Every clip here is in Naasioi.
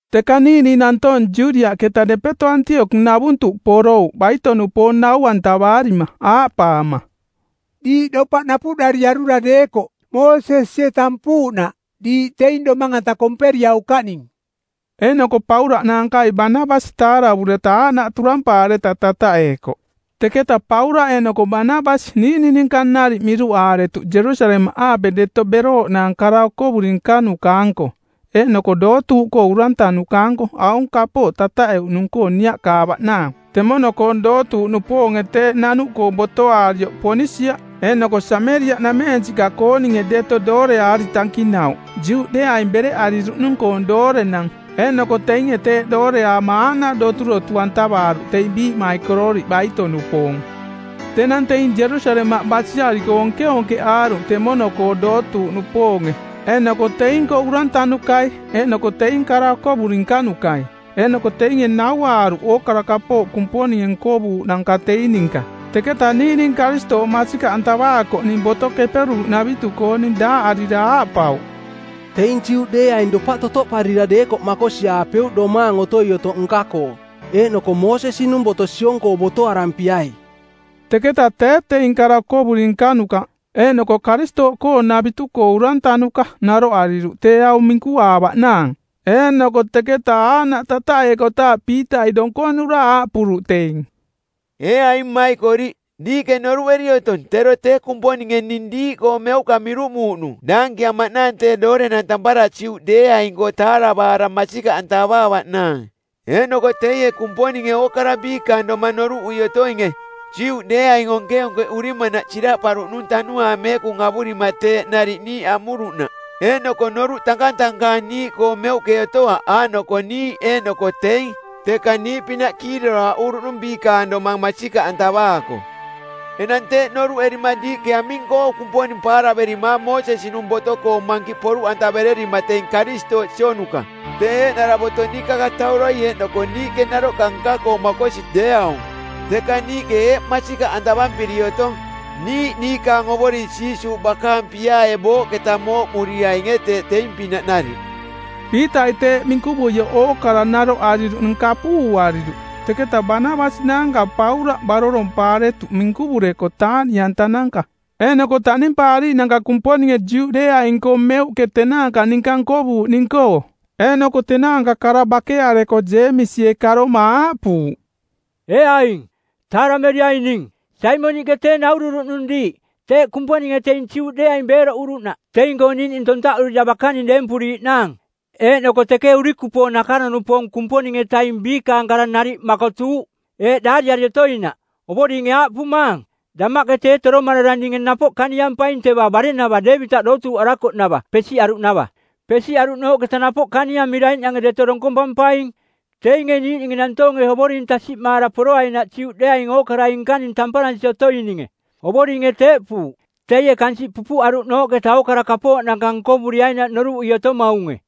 Teka niiꞌning nantoong Judiaꞌketa depeto Antiokoꞌnavuntuꞌ porouꞌ baito-nupoong nau-antavaarima aaꞌpaama, “Diiꞌ dopaꞌ napuꞌdariarura deekoꞌ, Moosesie tampuuꞌnaꞌ, diiꞌ teing domang-anta komperiaukaꞌning.” Eeꞌnoko Paulaꞌ naankai Banabasi taaravureta aaꞌnaꞌ turampaareta tataꞌeekoꞌ. Teketa Paulaꞌ eeꞌnoko Banabasi niiꞌning ninka nariꞌ miruꞌaaretuꞌ Jerusalemaꞌaape deto berooꞌnaang kara okovuri nkanuka-anko eeꞌnoko dootuuꞌkoo urantanuka-anko aung kapooꞌ tataꞌeuꞌnung-koo niaꞌkaavaꞌnaang. Temono-koong dootuuꞌnupoonge teeꞌ nanuꞌkoo botoaarioꞌ Ponisia eeꞌnoko Sameriaꞌnameensiꞌka-kooninge deto dooreaari tankinauꞌ Juꞌdeeaing bereꞌariruꞌnung-koong doorenang, eeꞌnoko teinge teeꞌ dooreaama aaꞌnaꞌ doturotu-antavaaruꞌ teing biiꞌmaikororiꞌ baito-nupoong. Tenang teing Jerusalemaꞌ basiariko onkeonkeꞌaaruꞌ temono-koo dootuuꞌnupoonge eeꞌnoko teing-koo urantanukai eeꞌnoko teing kara okovuri nkanukai. Eeꞌnoko teinge nauaaruꞌ ookara Kumponinge nkovuuꞌnanka teing ninka. Teketa niiꞌning Karistooꞌ masikaꞌantavaakoꞌning Boto Keperuuꞌnavitu-kooning˜ daaꞌarira aaꞌpauꞌ, “Teing Juꞌdeeaing dopaꞌ totoꞌparira deekoꞌ makosiaapeuꞌ domaang otoi otoꞌ nka-koo, eeꞌnoko Moosesi-nung boto siong-koo botoarampiai.” Teketa tee teing kara okovuri nkanuka eeꞌnoko Karistooꞌkoonavitu-koo urantanuka naroꞌariruꞌ tee aung minkuaavaꞌnaang. Eeꞌnoko teketa aaꞌnaꞌ tataꞌeekotaaꞌ Piitai donkonura aaꞌpuruꞌ teing, “Ee aing mmaikoriꞌ, diiꞌke noruꞌeri otong tero tee Kumponinge ning diiꞌkoo meuꞌka miruꞌmuuꞌnung daankiamaꞌnaang tee doorenang tampara Juꞌdeeaing-koo taaravaara masikaꞌantavaavaꞌnaang. Eeꞌnoko teie Kumponinge ookara biikaang domang noruꞌui otoinge Juꞌdeeaing onkeonkeꞌurimanaꞌ siraꞌparuꞌnung Tanuaang Meekung avurima teeꞌ nariꞌ niiꞌ amuruꞌnaꞌ. Eeꞌnoko noruꞌ tankatankaang niiꞌkoo meuꞌke otoaꞌ aaꞌnoko niiꞌ eeꞌnoko teing, teka niiꞌpinaꞌ kiiroraaꞌuruꞌnung biikaang domang masikaꞌantavaako. Enang teeꞌ noruꞌerima diiꞌke aming-koo Kumponing paaraverimaang Moosesi-nung boto-koo mankiꞌ poruꞌantavererima teing Karistooꞌ sionuka? Tee eeꞌnara boto niikakatauroi eeꞌnoko niiꞌke naroꞌka nka-koo makosi deeaung. Teka niiꞌke eeꞌ masikaꞌantavampiri otong niiꞌ niikaang Ovoring Jiisuuꞌ bakaang piaae booꞌketa mooꞌmuriainge teeꞌ teing-pinaꞌ nariꞌ.” Piitai teeꞌ minkuvuioꞌ ookara naroꞌariruꞌning kapuuariruꞌ, teketa Banabasi naanka Paulaꞌ barorompaaretuꞌ minkuvureko taaꞌniꞌantananka eeꞌnoko taꞌnimpaariiꞌnanka Kumponinge Juꞌdeeaing-koo meuꞌke tenaanka ninka nkovuuꞌning-koo. Eeꞌnoko tenaanka kara bakeareko Jeemisie karoma aaꞌpuuꞌ, “Ee aing, taarameriaing ning. Saimoniꞌke tee naururuꞌnung diiꞌ teeꞌ Kumponinge teing Juꞌdeeaing beeroꞌuruꞌnaꞌ teing-koo niiꞌning tontaꞌurira bakaning deempuriiꞌnaang. Eeꞌnoko teke urikupoong nakaro-nupoong Kumponing-etaing biikaang kara nariꞌ makotuuꞌ, eeꞌ daariari otoinaꞌ: ‘Ovoringe aaꞌpumaang, damaꞌke tee toromarara ninge napoꞌ kaniampaing teva bare-nava Deevitaꞌ dootuuꞌarakoꞌnava pesiꞌaruꞌnava. Pesiꞌaruꞌnooꞌketa napoꞌ kaniamiraiꞌnange deto donkompampaing teinge niiꞌninge nantoonge Ovoring tasiꞌmaara poroainaꞌ Juꞌdeeaing ookarai nkaning tamparansi otoininge. Ovoringe teeꞌpuuꞌ, teie kansiꞌ pupuꞌaruꞌnooꞌketa ookara kapooꞌnanka nkovuriainaꞌ noruꞌui otomaunge.’”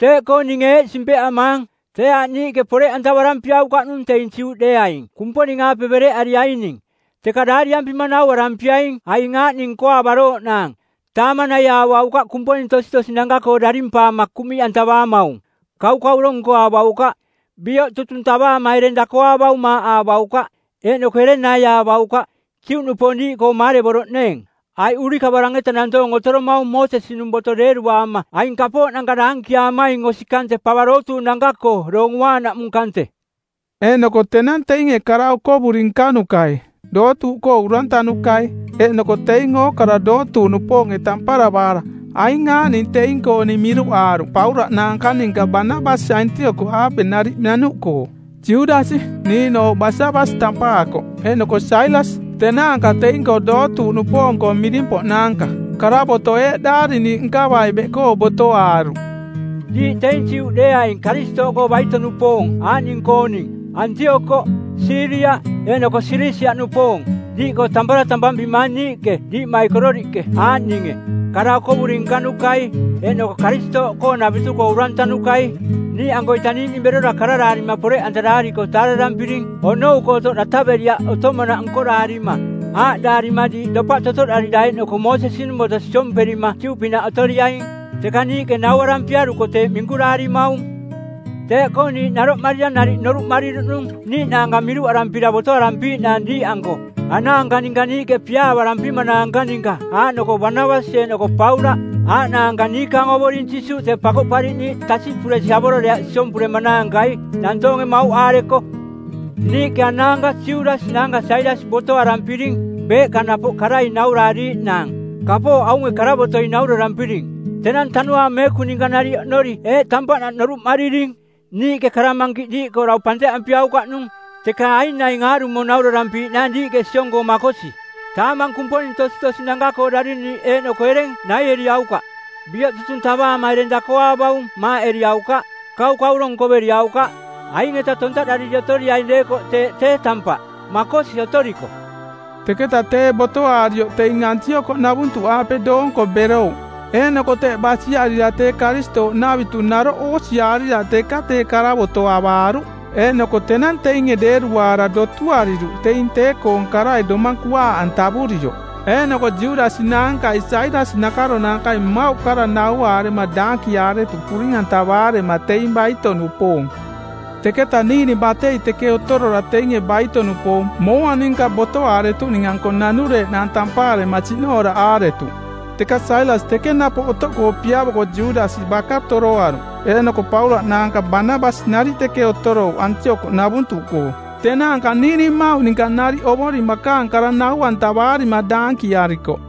“Teeꞌkoo ninge eeꞌ simpeꞌamaang, tee aaꞌ niiꞌke poreꞌantavarampiaukaꞌnung teing Juꞌdeeaing Kumponing-aape bereꞌariaining. Teka daariampima nauarampiaing aing aaꞌning nkoaavarooꞌnaang, taamang naiaavaukaꞌ kumponing tositosinanka-koo darimpaama kuꞌmiꞌantavaamaung, kaukauro nkoaavaukaꞌ, bioꞌ tutung tavaama ereng dakoaavaung maaꞌaavaukaꞌ, eeꞌnoko ereng naiaavaukaꞌ, Juꞌnupoong diiꞌkoo maarevoroꞌneeng. Aiꞌ urikavarang-eta nantoong otoromaung Moosesi-nung boto deeruaama aing kapooꞌnanka daankiaamaing osi kante pava dootuuꞌnanka-koo Doong Uaanaꞌmung kante.” Eeꞌnoko tenang teinge kara okovuri nkanukai, dootuuꞌkoo urantanukai, eeꞌnoko teing ookara dootuuꞌnupoonge tamparavaara, aing aaꞌning teing-kooning miruꞌaaruꞌ Paulaꞌ naanka ninka Banabasi Antiokoꞌaape nariꞌ nanuꞌkoo: Judasi, niiꞌnooꞌ Basabas tampaakoꞌ, eeꞌnoko Sailas, tenaanka teing-koo dootuuꞌnupoong-koo miring-poꞌnaanka. Karavoto˜ eeꞌ daariniiꞌ nkavai beꞌkoo botoaaruꞌ: “Diiꞌ teing Juꞌdeeaing Karistooꞌkoo baito-nupoong aaꞌning-kooning-Antiokoꞌ, Siiria eeꞌnoko Silisia-nupoong-diiꞌkoo tampara tampampimaang niiꞌke diiꞌmaikororiꞌke aaꞌninge: kara okovuri nkanukai eeꞌnoko Karistooꞌkoonavitu-koo urantanukai. Niiꞌankoita niiꞌning berora kararaarima poreꞌantaraariko taaravampiring onou-koo otoꞌ dataveriaꞌ otomanaꞌ nkoraarima, aaꞌdaarima diiꞌ dopaꞌ totoꞌdarira eeꞌnoko Moosesi-nung boto siomperima Juꞌpinaꞌ otoriaing. Teka niiꞌke nauarampiaruko teeꞌ minkuraarimaung. Teeꞌkoo niiꞌ naroꞌmarira nariꞌ noruꞌmariruꞌnung niiꞌnaanka miruꞌarampira botoarampiiꞌnaang diiꞌanko anaanka ninka niiꞌke piaavarampimanaanka ninka aaꞌnoko Banabasi eeꞌnoko Paulaꞌ; Aaꞌnaanka niikaang Ovoring Jiisuuꞌ tee Pakoꞌpariꞌniiꞌ tasiꞌpuresi avororeaꞌ siompuremanaankai, nantoonge mauꞌaareko. Niiꞌke anaanka Judasi naanka Sailas botoarampiring beeꞌka napoꞌ karai nauraariiꞌnaang kapooꞌ aunge karavotoi naurarampiring. Tenang Tanuaang Meekung ninka nariꞌ oꞌnori eeꞌ tampaꞌnaꞌ noruꞌmariring: Niiꞌke kara mankiꞌ diiꞌkoo dau panteꞌampiaukaꞌnung, teka aing naing aarumo naurarampiiꞌnaang diiꞌke siong-koo makosi: Taamang kumponing tositosinanka-koo dariniiꞌ eeꞌnoko ereng naieriaukaꞌ, bioꞌ tutung tavaama ereng dakoaavaung maaꞌeriaukaꞌ, kaukauro nkoveriaukaꞌ. Aing-eta tontaꞌdariri otoriaing deekoꞌ teeꞌ tee tampaꞌ. Makosi otoriko.” Teketa tee botoaarioꞌ teing Antiokoꞌnavuntuꞌaape doonko berouꞌ, eeꞌnoko teꞌ basiarira tee Karistooꞌnavitu naroꞌ oosiaarira teka tee karavoto avaaruꞌ. Eeꞌnoko tenang teinge deeruaara dotuariruꞌ teing tee-koong karai domang kuaaꞌantavurioꞌ. Eeꞌnoko Judasi naankai Sailas nakaronaankai mmauꞌ kara nauaarema daankiaretuꞌ puring-antavaarema teing baito-nupoong. Teketa niiꞌning batei teke otorora teinge baito-nupoong mooa ninka botoaaretuꞌning-anko nanureeꞌnaang tampaarema siꞌnooraꞌaaretuꞌ. Teka Sailas teke napoꞌ otoꞌkoo piavoko Judasi baka toroaruꞌ. Eeꞌnoko Paulaꞌ naanka Banabasi nariꞌ teke otorouꞌ Antiokoꞌnavuntuꞌkoo. Tenaanka niiꞌning mmauꞌ ninka nariꞌ Ovoring bakaang kara nau-antavarima daankiaarikoꞌ.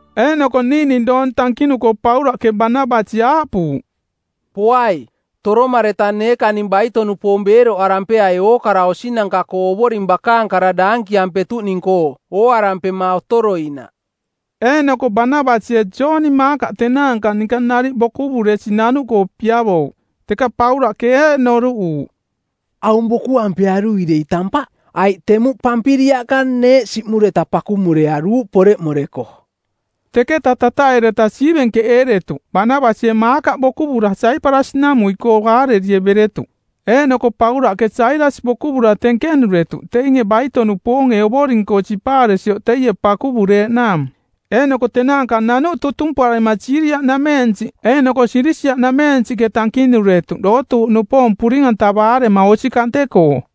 Eeꞌnoko niiꞌning doong tankinuko Paulaꞌke Banabasi aaꞌpuuꞌ, “Poai, toromareta neekaning baito-nupoong beeroꞌarampeai ookara osinanka-koo Ovoring bakaang kara daankiampetuꞌning-koo ooarampema otoroinaꞌ.” Eeꞌnoko Banabasie Jooni Maakaꞌ tenaanka ninka nariꞌ bokuvuresi nanuꞌkoo piavouꞌ. Teka Paulaꞌke eeꞌ noruꞌuuꞌ, “Aung bokuampearui dei tampaꞌ, aiꞌ temuꞌ Pampiliaꞌka neeꞌ siꞌmureta pakumurearuuꞌ poreꞌmoreko.” Teketa tataꞌeereta siivenkeꞌeeretuꞌ; Banabasie Maakaꞌ bokuvura Saiparasi-namuiꞌkoo aarerie beretuꞌ, eeꞌnoko Paulaꞌke Sailas bokuvura tenkenuretuꞌ teinge baito-nupoonge Ovoring-koo sipaaresioꞌ teie pakuvureeꞌnaang. Eeꞌnoko tenaanka nanuꞌ tutumparema Siiria-nameensiꞌ eeꞌnoko Silisia-nameensiꞌke tankinuretuꞌ dootuuꞌnupoong puring-antavaarema osi kante-koo.